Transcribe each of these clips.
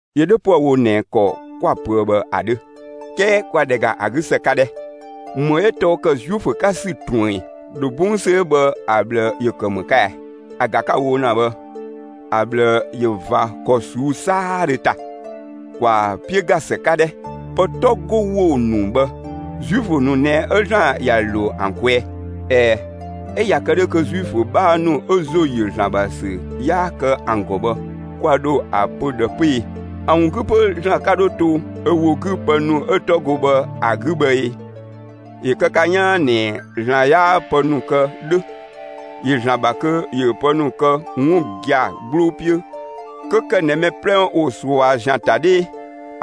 ‑Yö 'dhö 'püë‑ wo ꞊nɛ ‑kɔ 'kwa‑ pöë bhë ‑a 'dhö, 'kɛɛ ‑kwa ‑dhɛ ‑ga ‑a 'gü ‑së 'ka 'dhɛ! ‑Më 'ö tɔɔ ‑kë Zuifö 'ka ‑sü ꞊truën ꞊ɛn? ‑Dho 'bɔng ‑sü 'ö bhë ‑a ꞊bhlë ‑yö ‑kë ‑më 'ka ɛ? ‑A ‑ga 'ka‑ wo ‑na bhë ‑a ꞊bhlë ꞊yö ꞊va ‑kɔ ꞊suu'‑ 'saadhö ‑ta. ‑Kwaa 'piö ‑ga ‑së 'ka 'dhɛ! Pë 'tɔ 'go ‑wo ‑nu bhë, Zuifö ‑nu ꞊nɛ 'ö ‑Zlan ‑ya ‑lo ‑an kwɛɛ. ꞊Ɛɛ, 'ö ꞊ya kë 'dhö kö Zuifö 'bhaa ‑nu 'ö ‑zo ‑yö ‑Zlan ‑bha ‑sü yaa kë ‑an ‑gɔ bhë, kwa ‑dho ‑a pö ꞊dhë 'pö ee? ‑A ‑wun 'gü 'pö ‑Zlan 'ka 'dho to ö ‑wo 'gü pë ‑nu 'ö 'tɔ go bhë ‑a 'gü bhë ꞊ee? ‑Yö kë ka 'yaan ꞊nɛ ‑Zlan 'yaa pë ‑nu kë 'dhö. ‑Yö ‑Zlan ‑bha kö ‑yö pë ‑nu kë 'wun gia‑ 'gbloo 'piö 'kö ‑kë ꞊nɛ mɛ 'plɛ ‑wo ꞊sua ‑zian ‑ta 'dhee.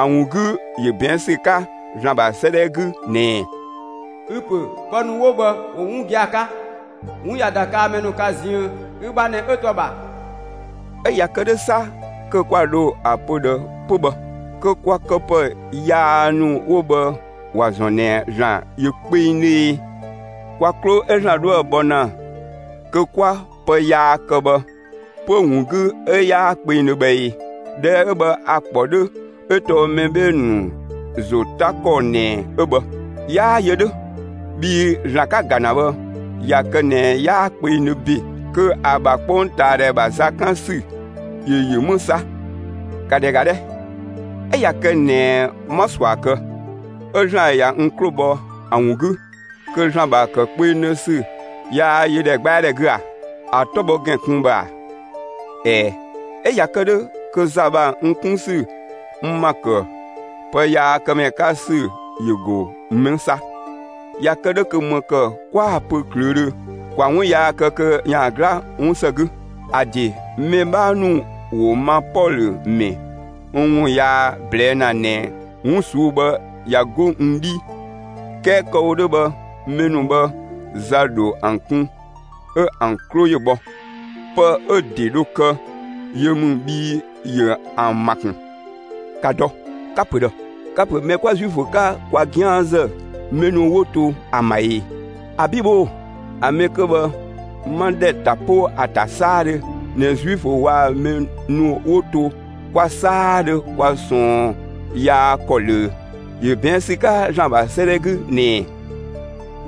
‑A ‑wun 'gü, ‑yö ꞊bɛɛn' ‑sü 'ka (‑Zlan ‑bha 'sëëdhɛ 'gü) ꞊nɛɛ: Ü pö ‑pë ‑nu 'wo bhë ‑wo gia‑ 'ka. 'Wun ꞊ya ‑da kaa‑ mɛ ka ziën, ü ‑bha ꞊nɛ 'ö to ‑a ‑bha. 'Ö ‑ya kë 'dhö 'sa kö kwa ‑dho ‑a pö ꞊dhë 'pö bhë? Kö kwa këpë yaa ‑nu 'wo bhë ‑wa ‑zɔn ꞊nɛ ‑Zlan ‑yö kpengdhö e? Kwa 'klo 'ö ‑Zlan 'dhoë‑ bhɔ ‑na kö 'kwa pë yaa kë bhë 'pö‑ ‑wun 'gü 'ö 'yaa kpengdhö bhë ee? ꞊Dhɛɛ' 'ö bhë 'a‑ ‑kpɔ 'dhö 'ö tɔɔ mɛ 'bhee‑ ‑nu ‑zo 'ta ‑kɔ ꞊nɛ 'ö bhë. 'Yaa yö 'dhö! Bhii ‑Zlan ka‑ ‑ga ‑na bhë, ꞊ya kë ꞊nɛ 'yaa kpengdhö ‑be, kö ‑a ‑bha 'kpongtaadhɛ ‑bha za 'kan ‑sü ‑yö ‑yö 'më 'sa? ‑Ka ‑dhɛ ‑ga 'dhɛ! 'Ö ꞊ya kë ꞊nɛ 'ma ꞊sua kë, 'ö ‑Zlan ꞊ya n 'klo bhɔ ‑a ‑wun 'gü, kö ‑Zlan ‑bha ‑kë kpengdhö ‑sü yaa yö ‑dhɛgbɛadhɛ 'gü a. ‑A 'tɔ bhɔ ‑gɛn kun bhë ꞊a? ꞊Ɛɛ, 'ö ꞊ya kë 'dhö, kö za ‑bha n 'kun ‑sü n ‑ma ‑kë ‑pë yaa kë ‑mɛ 'ka ‑sü ‑yö ‑go 'më 'sa? ꞊Ya kë 'dhö kö ‑më ‑kë 'kwaa‑ pö ꞊klöödhö: «‑Kwa 'wun yaa kë kö ‑yaan 'gla 'wun ‑së 'gü.» ‑A ‑de mɛ 'bhaa ‑nu ‑wo ma Pɔlö ‑mɛ n ‑wun yaa ꞊blɛɛ' ‑na ꞊nɛ 'wun ꞊suu'‑ bhë ꞊ya 'go n 'dhii. 'Kɛɛ kë‑ wo 'dhö bhë mɛ ‑nu bhë, za ‑dho ‑an kun 'ö ‑an 'klo ‑yö bhɔ; pë 'ö‑ ‑de dho kë ‑yö ‑mü bhii ‑yö ‑an ‑ma ‑kun! ‑Ka dɔ! Ka‑ ‑pö ꞊dhë! Ka‑ ‑pö mɛ 'kwa Zuifö 'ka, kwa 'gianzë mɛ ‑nu 'wo to ‑an ‑bha ‑ee? ‑Abi' bhoo‑! ‑A mɛ 'kö bhë 'ma ‑dhɛ ta 'po ‑a ‑ta 'saadhö ꞊nɛ Zuifö waa‑ mɛ ‑nu 'wo to kwa 'saadhö kwa ꞊sɔɔn yaa ‑kɔ ꞊löö. ‑Yö ꞊bɛɛn' ‑sü 'ka ‑Zlan ‑bha 'sëëdhɛ 'gü ꞊nɛɛ: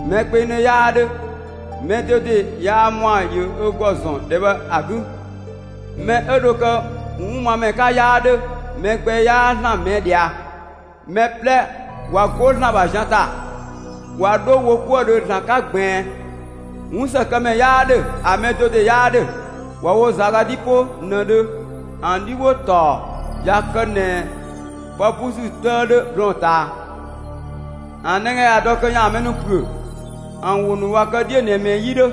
Mɛ kpengdhö 'yaa 'dhö; mɛ do ‑de yaa ‑mɔa ‑yö ö ‑gɔ ‑zɔn ‑dhɛ bhë ‑a 'gü. Mɛ 'ö dho kë 'wunmamɛ 'ka 'yaa 'dhö. Mɛ gbɛ 'yaa ‑Zlan ꞊mɛɛ' ꞊dhia. Mɛ 'plɛ ꞊wa 'go ‑Zlan ‑bha zian ‑ta, ꞊wa 'dho wo 'kuëdhö ‑Zlan 'ka ꞊gbiin. 'Wunsëkëmɛ 'yaa 'dhö. ‑A mɛ do ‑de 'yaa 'dhö. ꞊Wa wo ꞊za ga 'dhi 'po ꞊nëdhö, ‑an 'dhi ‑wo ‑taɔ ꞊ya kë ꞊nɛ pë 'busü 'tëë 'dhö blɔɔn‑ ꞊taa; ‑an nɛga ꞊ya dɔ kö ‑yaan mɛ ‑nu ‑püö; ‑an ‑wo ‑nu ꞊wa kë 'dhiö‑ ꞊nɛ ꞊mɛɛ 'yi 'dhö.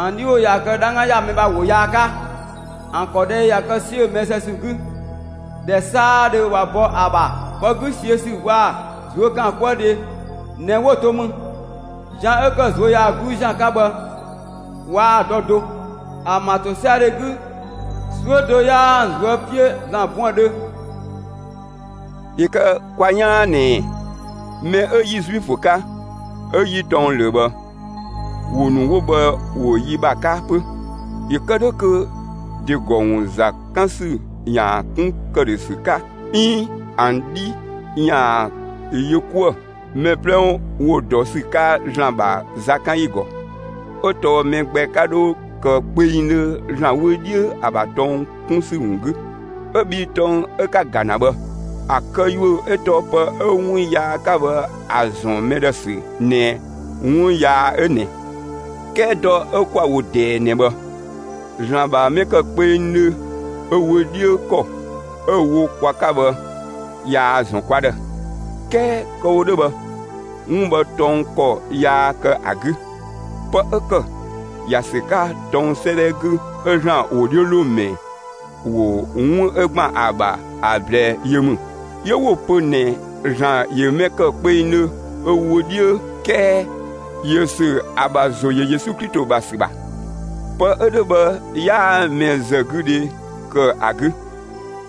‑An 'dhi ‑wo ꞊ya kë 'dhangga ‑ya mɛ ‑bha ‑wo yaa 'ka. ‑An ‑kɔ 'dhee ꞊ya kë 'siö mɛ zë ‑sü 'gü. ‑Dhɛ 'saadhö ꞊wa bɔ ‑a ‑bha, pë 'güsiödhe waa‑ ꞊zuökaankuëdhe ꞊nɛ 'wo‑ to mü. Zian 'ö ‑kë ꞊zuöyagluu ‑zian 'ka bhë waa‑ dɔ do. ‑An ‑bha ‑tosiadhe 'gü, 'suö do 'yaa ‑an ꞊zuö' 'piö ‑Zlan buëndhö. ‑Yö kë kwa 'yaan ꞊nɛɛ: Mɛ 'ö 'yi Zuifö 'ka, 'ö 'yi tɔng ꞊löö bhë, ‑wo ‑nu 'wo bhë ‑wo yi ‑bha 'ka 'pö, ‑yö kë 'dhö kö ‑de ‑gɔ ‑wun ‑za 'kan ‑sü ‑yaan 'kun ‑këdhösü 'ka 'iin ‑an 'dhi ‑yaan yö 'kuë‑. Mɛ 'plɛ ‑wo dɔ ‑sü 'ka ‑Zlan ‑bha zakanyi ‑gɔ. 'Ö tɔɔ mɛ gbɛ 'ka 'dho kë kpengdhö ‑Zlan wö 'dhiö ‑a ‑bha tɔng 'kun ‑sü ‑wun 'gü. 'Ö bhii tɔng 'ö 'ka‑ ‑ga ‑na bhë, ‑a këyuö 'ö tɔɔ pë 'ö 'wun yaa 'ka bhë ‑a ‑zɔn mɛ ‑dhë ‑sü ꞊nɛ 'wun yaa 'ö ꞊nɛ. 'Kɛɛ dɔ 'ö 'kwa‑ wo ꞊dɛɛ ꞊nɛ bhë, ‑Zlan ‑bha mɛ ‑kë kpengdhö ö wö 'dhiö ‑kɔ 'ö‑ wo kwa 'ka bhë, ꞊yaa‑ ‑zɔn kwa ‑dhë. 'Kɛɛ kë‑ wo 'dhö bhë, 'wun bhë tɔng ‑kɔ yaa kë ‑a 'gü. Pë 'ö ‑kë ‑ya ‑sü 'ka tɔng 'sëëdhɛ 'gü 'ö ‑Zlan ‑wodhiölomɛ ‑wo 'wun 'ö ‑gban ‑a ‑bha ‑a ꞊blɛɛ yö ‑mü. 'Yö 'wo‑ pö ꞊nɛ ‑Zlan ‑yö mɛ ‑kë kpengdhö (ö wö 'dhiö); 'kɛɛ ‑yö ‑sü ‑an ‑bha ‑zo ‑yö Yesu Klito ‑bha ‑sü ‑bha. Pë 'ö dhö bhë 'yaa mɛzëgüdhe kë ‑a 'gü;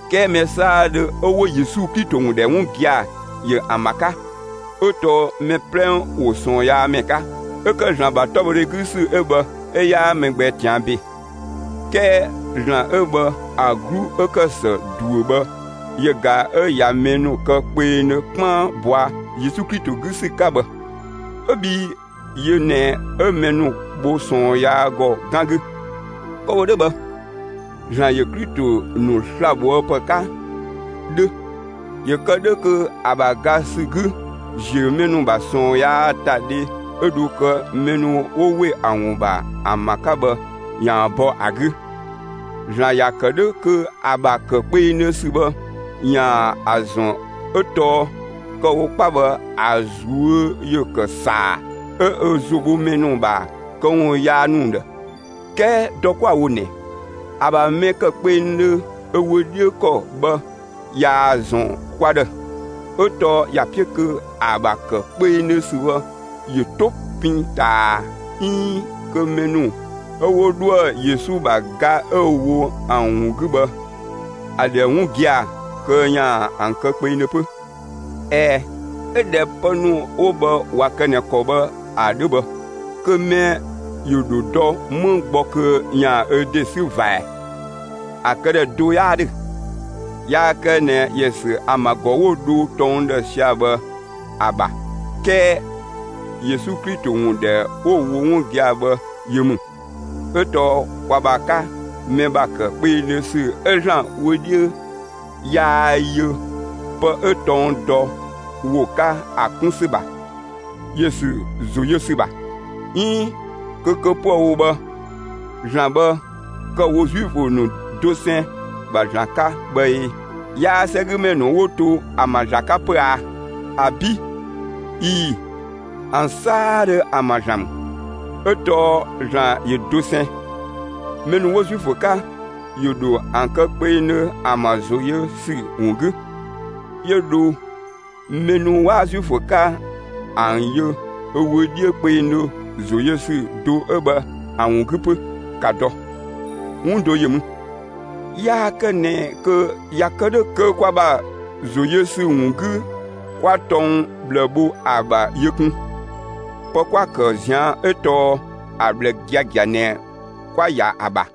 'kɛɛ mɛ 'saadhö 'ö 'wo Yesu Klito ‑wun ‑dhɛ 'wun gia‑ ‑yö ‑an ‑bha 'ka. 'Ö tɔɔ mɛ 'plɛ ‑wo ꞊sɔɔnyaamɛ 'ka; 'ö ‑kë ‑Zlan ‑bha 'tɔbhɔdhɛ 'gü ‑sü 'ö bhë 'ö 'yaa mɛ gbɛ ꞊tian' ‑be. 'Kɛɛ ‑Zlan 'ö bhë ‑a 'glu 'ö ‑kë ‑së ꞊duö bhë yö ꞊ga 'ö ꞊ya mɛ ‑nu kë kpengdhö 'kpaan ‑bɔa Yesu Klito 'gü ‑sü 'ka bhë, 'ö bhii yö ꞊nɛ 'ö mɛ ‑nu bho ꞊sɔɔn yaa ‑gɔ 'gan 'gü. Kë‑ wo 'dhö bhë, ‑Zlan ‑yö Klito ‑nu sla‑ bhoë ‑pë 'ka 'dhö ‑yö kë 'dhö kö ‑a ‑bha ga ‑sü 'gü, ‑ziö mɛ ‑nu ‑bha ꞊sɔɔn yaa ‑ta dhe 'ö dho kë mɛ ‑nu 'wo ‑we ‑a ‑wun ‑bha ‑an ‑bha 'ka bhë, ‑yaan bɔ ‑a 'gü. ‑Zlan ‑ya ‑kë 'dhö kö ‑a ‑bha ‑kë kpengdhö ‑sü bhë, ‑yaan ‑a ‑zɔn 'ö tɔɔ kë‑ wo 'kpa bhë ‑a ꞊zuö' ‑yö ‑kë ‑saa 'ö ö ‑zo bho mɛ ‑nu ‑bha këwun yaa ‑nu ‑dhë; 'kɛɛ dɔ 'kwa‑ wo ꞊nɛ, ‑a ‑bha mɛ ‑kë kpengdhö ö wö 'dhiö ‑kɔ bhë, ꞊yaa‑ ‑zɔn kwa ‑dhë; 'ö tɔɔ ‑ya 'piö kö ‑a ‑bha ‑kë kpengdhö ‑sü bhë ‑yö 'to pin ꞊taa 'iin kö mɛ ‑nu 'ö 'wo 'dhoë‑ Yesu ‑bha ga 'ö‑ wo ‑an ‑wun 'gü bhë ‑a ‑dhɛ 'wun gia‑, kö ‑yaan ‑an kë kpengdhö 'pö. ꞊Ɛɛ, 'ö ꞊dhɛ pë ‑nu 'wo bhë ꞊wa kë ꞊nɛ ‑kɔ bhë ‑a 'dhö bhë, kö mɛ ‑yö ‑dho dɔ 'më gbɔ kö ‑yaan ö ‑de 'sü ꞊va ꞊ɛɛ? ‑A këdhɛ do 'yaa 'dhö. Yaa kë ꞊nɛ ‑yö ‑sü ‑an ‑bha ‑gɔ 'wo‑ dho tɔng ‑dhë sia‑ bhë ‑a ‑bha 'kɛɛ Yesu Klito ‑wun ‑dhɛ 'wo ‑wo 'wun gia‑ bhë yö ‑mü. 'Ö tɔɔ kwa ‑bha 'ka, mɛ ‑bha ‑kë kpengdhö ‑sü 'ö ‑Zlan wö 'dhiö yaa yö pë 'ö tɔng dɔ ‑wo 'ka ‑a 'kun ‑sü ‑bha; yö ‑sü ‑zo yö ‑sü ‑bha. 'Iin kö kë 'püë‑ wo bhë, ‑Zlan bhë kë‑ wo Zuifö ‑nu dosɛn ‑bha ‑Zlan 'ka bhë ee? 'Yaa 'sɛgümɛ ‑nu 'wo to ‑an ‑bha ‑Zlan 'ka 'pö aa? ‑Abi' ii, ‑an 'saadhö ‑an ‑bha ‑Zlan ‑mü. 'Ö tɔɔ ‑Zlan ‑yö dosɛn. Mɛ ‑nu 'wo Zuifö 'ka ‑yö ‑dho ‑an kë kpengdhö ‑an ‑bha ‑zo yö ‑sü ‑wun 'gü; 'yö dho mɛ ‑nu 'waa Zuifö 'ka ‑an yö ö wö 'dhiö kpengdhö ‑zo yö ‑sü do 'ö bhë ‑a ‑wun 'gü 'pö. ‑Ka dɔ, 'wun do ‑yö mü. Yaa kë ꞊nɛ kö ꞊ya kë 'dhö kö kwa ‑bha ‑zo yö ‑sü ‑wun 'gü 'kwa tɔng ꞊bhlë bho ‑a ‑bha yö kun. Pë 'kwa‑ ‑kë ꞊zian' 'ö tɔɔ ‑a ꞊bhlë giagia ꞊nɛ 'kwa‑ ‑ya ‑a ‑bha.